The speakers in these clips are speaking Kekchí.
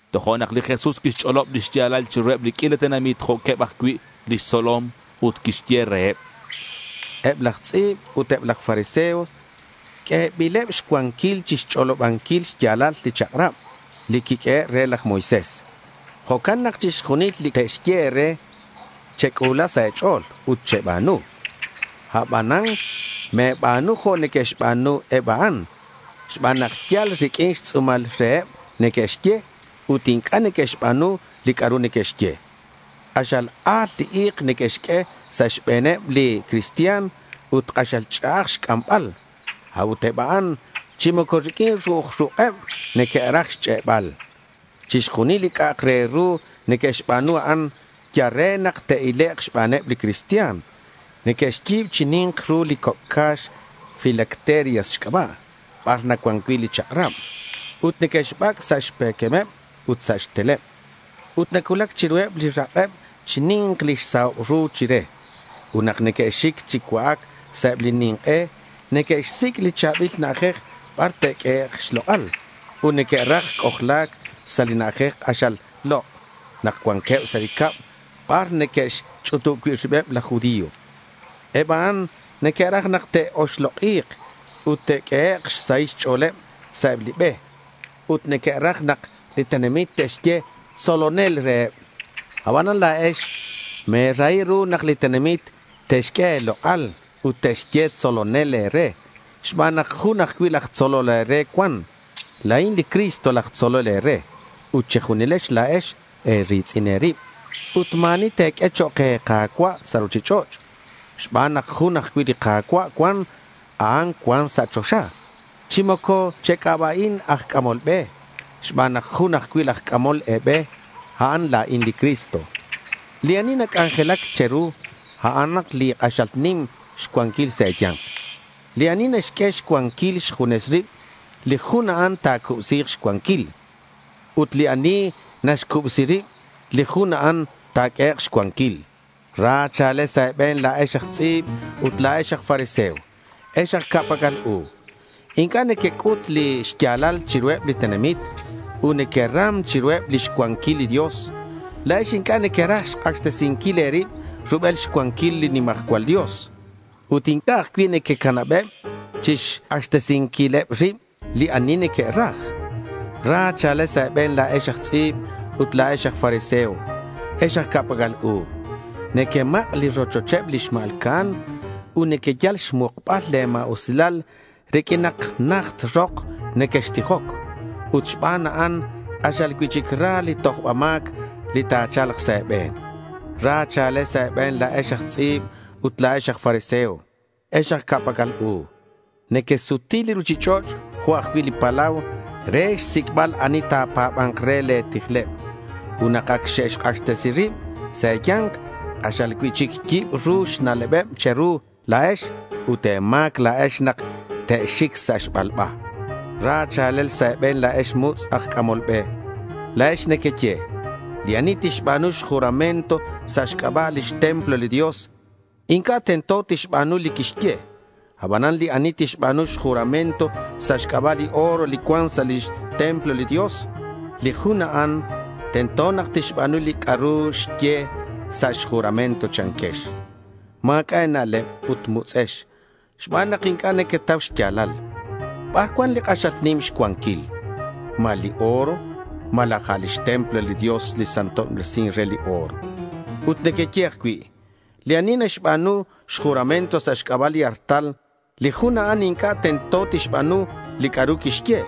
Tojo'nak li Jesús quixch'olob li xya̱lal chiruheb li q'uila tenamit jo'queb ajcui' lix tzolom ut quixye reheb: —Eb laj tz'i̱b ut eb laj fariseo, q'uebileb xcuanquil chixch'olobanquil xya̱lal li chak'rab li quiq'uehe' re laj Moisés. Jo'can nak chixjunil li te'xye e̱re, chec'u̱la sa' e̱ch'o̱l ut cheba̱nu. Abanan me̱ba̱nu jo' neque'xba̱nu eb a'an xban nak yal riq'uin xtz'u̱mal reheb neque'xye ut inc'a' neque'xba̱nu li c'a'ru neque'xye. K'axal a̱l li i̱k neque'xq'ue sa' xbe̱neb li cristian ut k'axal ch'a'aj xc'ambal. A'ut eb a'an chi moco riq'uin ru'uj ruk'eb neque'raj xch'e'bal. Chixjunil li c'a'ak re ru neque'xba̱nu, a'an yal re nak te'ilek' xbaneb li cristian. Neque'xyi̱b chi ni̱nk ru li coc' ca̱x filacterias xc'aba' bar nacuan cui' li chak'rab ut neque'xbac' sa' xpe̱quemeb ut sa' xteleb. Ut nacuulac chiruheb li rak'eb chi ni̱nk lix sahob ru chire. Ut nak neque'xic chi cua'ac sa' eb li nink'e neque'xsic' li cha̱bil na'ajej bar te'q'uehek' xlok'al, ut neque'raj c'ojla̱c sa' li na'ajej k'axal lok' nak cuanqueb sa' li cab bar neque'xch'utub cui' ribeb laj judío. Eb a'an neque'raj nak te'oxlok'i̱k ut te'q'uehek' xsahil xch'o̱leb sa' eb li be. Ut neque'raj nak li tenamit te'xye “tzolonel” reheb. Abanan la̱ex me̱rahi ru nak li tenamit te'xq'ue e̱lok'al ut te'xye “tzolonel” e̱re xban nak jun ajcui' laj tzolol e̱re cuan. La̱in li Cristo laj tzolol e̱re ut che̱junilex la̱ex e̱ri̱tz'in e̱rib. Ut ma̱ ani te̱q'ue chok' e̱ka̱cua' sa' ruchich'och', xban nak jun ajcui' li Ka̱cua' cuan. A'an cuan sa' choxa. Chi moco chec'aba'in aj c'amol be, xban nak jun ajcui' laj c'amol e̱be. A'an la̱in li Cristo. Li ani nac'anjelac che̱ru, a'an li k'axal nim xcuanquil sa' e̱ya̱nk. Li ani naxq'ue xcuanquil xjunes rib, li jun a'an ta̱cubsi̱k xcuanquil. Ut li ani naxcubsi rib, li jun a'an ta̱q'uehek' xcuanquil. Ra cha̱lel sa' e̱be̱n, la̱ex aj tz'i̱b ut la̱ex aj fariseo, ex aj ca'pac'al u. Inc'a' nequec'ut li xya̱lal chiruheb li tenamit ut nequeram chiruheb lix cuanquil li Dios. La̱ex inc'a' nequeraj xk'axtesinquil e̱rib rubel xcuanquil li nimajcual Dios ut inc'a' ajcui' nequecanabeb chixk'axtesinquileb rib li ani neque'raj. Ra cha̱lel sa' e̱be̱n, la̱ex aj tz'i̱b ut la̱ex aj fariseo, ex aj ca'pac'al u. Nequemak' li rochocheb li xma̱lca'an ut nequeyal xmukbal le̱ ma̱usilal riq'uin nak najt rok nequextijoc. Ut xban a'an k'axal cui'chic ra li tojbal ma̱c li ta̱cha̱lk sa' e̱be̱n. Ra cha̱lel sa' e̱be̱n la̱ex aj tz'i̱b ut la̱ex aj fariseo, ex aj ca'pac'al u. Nequesuti li ruchich'och' jo' ajcui' li palau re xsic'bal ani ta̱pa̱ba̱nk re le̱ tijleb. Ut nak ac xe'xk'axtesi rib sa' e̱ya̱nk, k'axal cui'chic yibru xna'lebeb che̱ru la̱ex ut e̱ma̱c la̱ex nak te'xic sa' xbalba. Ra cha̱lel sa' e̱be̱n, la̱ex mutz' aj c'amol be. La̱ex nequeye: —Li ani tixba̱nu xjuramento sa' xc'aba' lix templo li Dios, inc'a' tento tixba̱nu li quixye. Abanan li ani tixba̱nu xjuramento sa' xc'aba' li oro li cuan sa' lix templo li Dios, li jun a'an tento nak tixba̱nu li c'a'ru xye sa' xjuramento, chanquex. Ma̱c'a' e̱na'leb ut mutz'ex xban nak inc'a' nequetau xya̱lal. ¿Bar cuan li k'axal nim xcuanquil? ¿Ma li oro, malaj a' lix templo li Dios li nasantobresin re li oro? Ut nequeye ajcui': —Li ani naxba̱nu xjuramento sa' xc'aba' li artal, li jun a'an inc'a' tento tixba̱nu li c'a'ru quixye.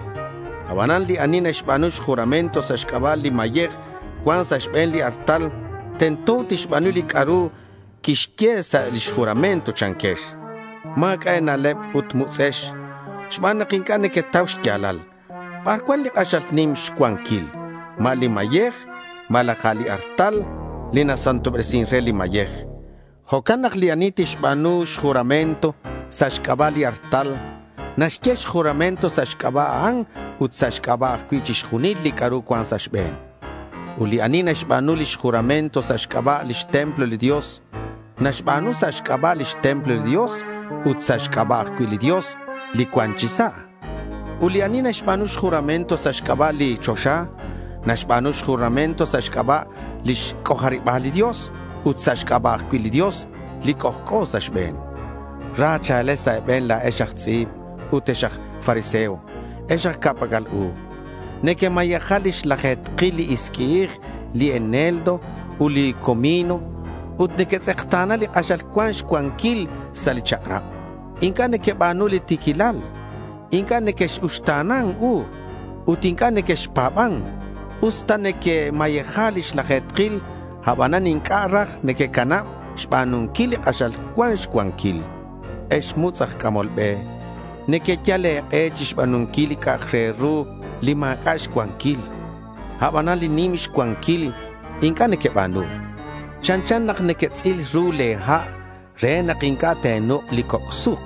Abanan li ani naxba̱nu xjuramento sa' xc'aba' li mayej cuan sa' xbe̱n li artal, tento nak tixba̱nu li c'a'ru quixye sa' lix juramento, chanquex. Ma̱c'a' e̱na'leb ut mutz'ex xban nak inc'a' nequetau xya̱lal. ¿Bar cuan li k'axal nim xcuanquil? ¿Ma li mayej malaj a' li artal li nasantobresin re li mayej? Jo'can nak li ani tixba̱nu xjuramento sa' xc'aba' li artal, naxye xjuramento sa' xc'aba' a'an ut sa' xc'aba' ajcui' chixjunil li c'a'ru cuan sa' xbe̱n. Ut li ani naxba̱nu lix juramento sa' xc'aba' lix templo li Dios, naxba̱nu sa' xc'aba' lix templo li Dios ut sa' xc'aba' ajcui' li Dios li nacuan chi sa'. Ut li ani naxba̱nu xjuramento sa' xc'aba' li choxa, naxba̱nu xjuramento sa' xc'aba' lix c'ojariba̱l li Dios ut sa' xc'aba' ajcui' li Dios li c'ojc'o sa' xbe̱n. Ra cha̱lel sa' e̱be̱n la̱ex aj tz'i̱b ut ex aj fariseo, ex aj ca'pac'al u. Nequemayeja lix laje̱tkil li isqui'ij, li eneldo ut li comino. Ut nequetz'ekta̱na li k'axal cuan xcuanquil sa' li chak'rab. Inc'a' nequeba̱nu li ti̱quilal. Inc'a' nequex-uxta̱nan u ut inc'a' nequexpa̱ban. Us nak nequemayeja lix laje̱tkil abanan inc'a' raj nequecanab xba̱nunquil li k'axal cuan xcuanquil. Ex mutz' aj c'amol be, nequeyal e̱k'e chixba̱nunquil li c'a'ak re ru li ma̱c'a' xcuanquil, abanan li nim xcuanquil inc'a' nequeba̱nu. Chanchan nak nequetz'il ru le̱ ha' re nak inc'a' te̱nuk' li coc' suk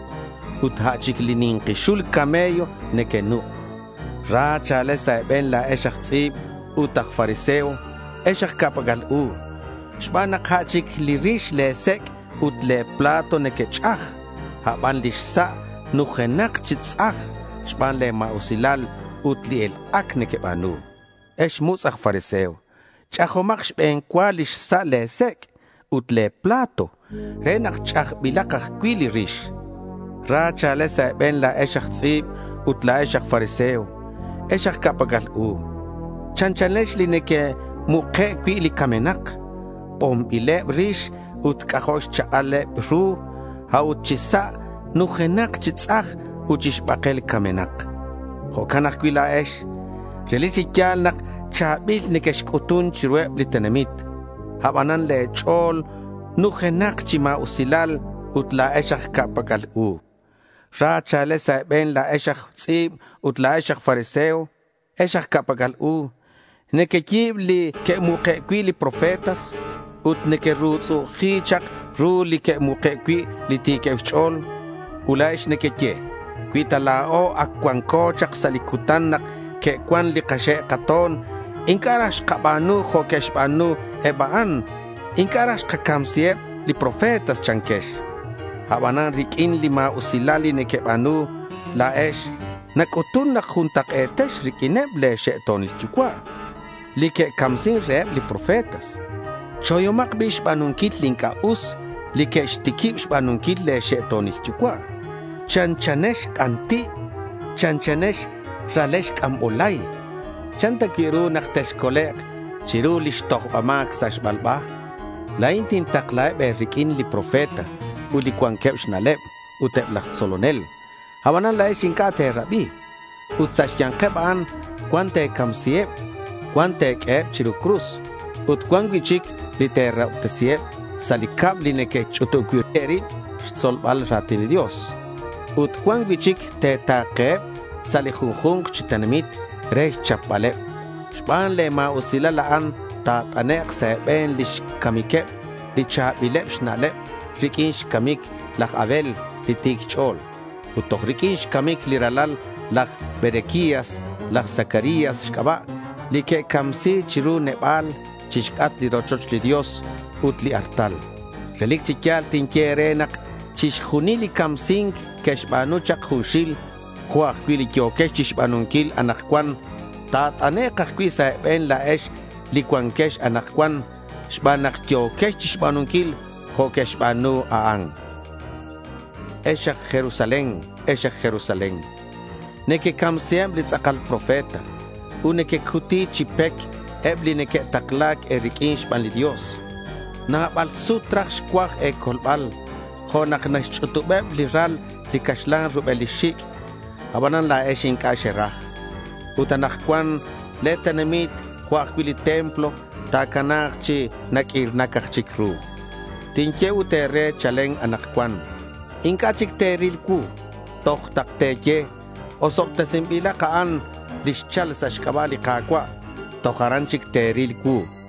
ut a' chic li ni̱nki xul camello nequenuk'. Ra cha̱lel sa' e̱be̱n la̱ex aj tz'i̱b ut aj fariseo, ex aj ca'pac'al u, xban nak a' chic li rix le̱ sec' ut le̱ plato nequech'aj, aban lix sa' numtajenak chi tz'aj xban le̱ ma̱usilal ut li elk'ac nequeba̱nu. Ex mutz' aj fariseo, ch'ajomak xbe̱n cua lix sa' le̱ sec' ut le̱ plato re nak ch'ajbilak ajcui' li rix. Ra cha̱lel sa' e̱be̱n la̱ex aj tz'i̱b ut la̱ex aj fariseo, ex aj ca'pac'al u. Chanchanex li neque'muke' cui' li camenak. Bonbileb rix ut c'ajo' xchak'al eb ru, a'ut chi sa' nujenak chi tz'aj ut chi xbakel camenak. Jo'can ajcui' la̱ex. Relic chi ya̱l nak cha̱bil nequexc'utun chiruheb li tenamit. Abanan le̱ ch'o̱l nujenak chi ma̱usilal ut la̱ex aj ca'pac'al u. Ra cha̱lel sa' e̱be̱n la̱ex aj tz'i̱b ut la̱ex aj fariseo, ex aj ca'pac'al u. Nequeyi̱b li que'muke' cui' li profetas ut nequerutz'u'uji chak ru li que'muke' cui' li ti̱queb xch'o̱l. Ut la̱ex nequeye: —Cui ta la̱o ac cuanco chak sa' li cutan nak xe'cuan li kaxe' kato̱n, inc'a' raj xkaba̱nu jo' que'xba̱nu eb a'an. Inc'a' raj xkacamsiheb li profetas, chanquex. Abanan riq'uin li ma̱usilal li nequeba̱nu la̱ex, nac'utun nak juntak'e̱tex riq'uineb le̱ xe'to̱nil yucua', li que'camsin reheb li profetas. Choyomak bi' xba̱nunquil li inc'a' us li que'xtiquib xba̱nunquil le̱ xe'to̱nil yucua'. Chanchanex c'anti', chanchanex ralex c'ambolay, ¿chan ta cui' ru nak texcolek' chiru lix tojba ma̱c sa' xbalba? La̱in tintaklaheb e̱riq'uin li profeta ut li cuanqueb xna'leb ut eb laj tzolonel. Abanan la̱ex inc'a' te̱rabi. Ut sa' xya̱nkeb a'an, cuan te̱camsiheb, cuan te̱q'ueheb chiru cruz, ut cuan cui'chic li te̱rahobtesiheb sa' li cab li nequech'utub cui' e̱rib chixtzolbal ra̱tin li Dios. Ut cuan cui'chic te̱ta̱keheb sa' li junju̱nk chi tenamit re xchapbaleb. Xban le̱ ma̱usilal a'an, ta̱t'anek' sa' e̱be̱n lix camiqueb li cha̱bileb xna'leb riq'uin xcamic laj Abel li ti̱c xch'o̱l ut toj riq'uin xcamic li ralal laj Berequías laj Zacarías xc'aba' li quecamsi chiru neba̱l chixc'atk li rochoch li Dios ut li artal. Relic chi ya̱l tinye e̱re nak chixjunil li camsi̱nc que'xba̱nu chak junxil, jo' ajcui' li yo̱quex chixba̱nunquil anakcuan, ta̱t'anek' ajcui' sa' e̱be̱n la̱ex li cuanquex anakcuan xban nak yo̱quex chixba̱nunquil jo' que'xba̱nu eb a'an. Ex aj Jerusalén, ex aj Jerusalén, neque-camsiheb li tz'akal profeta ut nequecuti chi pec eb li neque'takla̱c e̱riq'uin xban li Dios. Nabal sut raj xcuaj e̱colbal jo' nak naxch'utubeb li ral li caxlan rubel lix xic'. Abanan la̱ex inc'a' xeraj. Ut anakcuan le̱ tenamit jo' ajcui' li templo ta̱cana̱k chi naq'uirnac aj chic ru. Tinye ut e̱re chalen anakcuan inc'a' chic te̱ril cuu toj nak te̱ye, “Osobtesinbilak a'an li xchal sa' xc'aba' li Ka̱cua'”. Toj aran chic te̱ril cuu, chan li Jesús.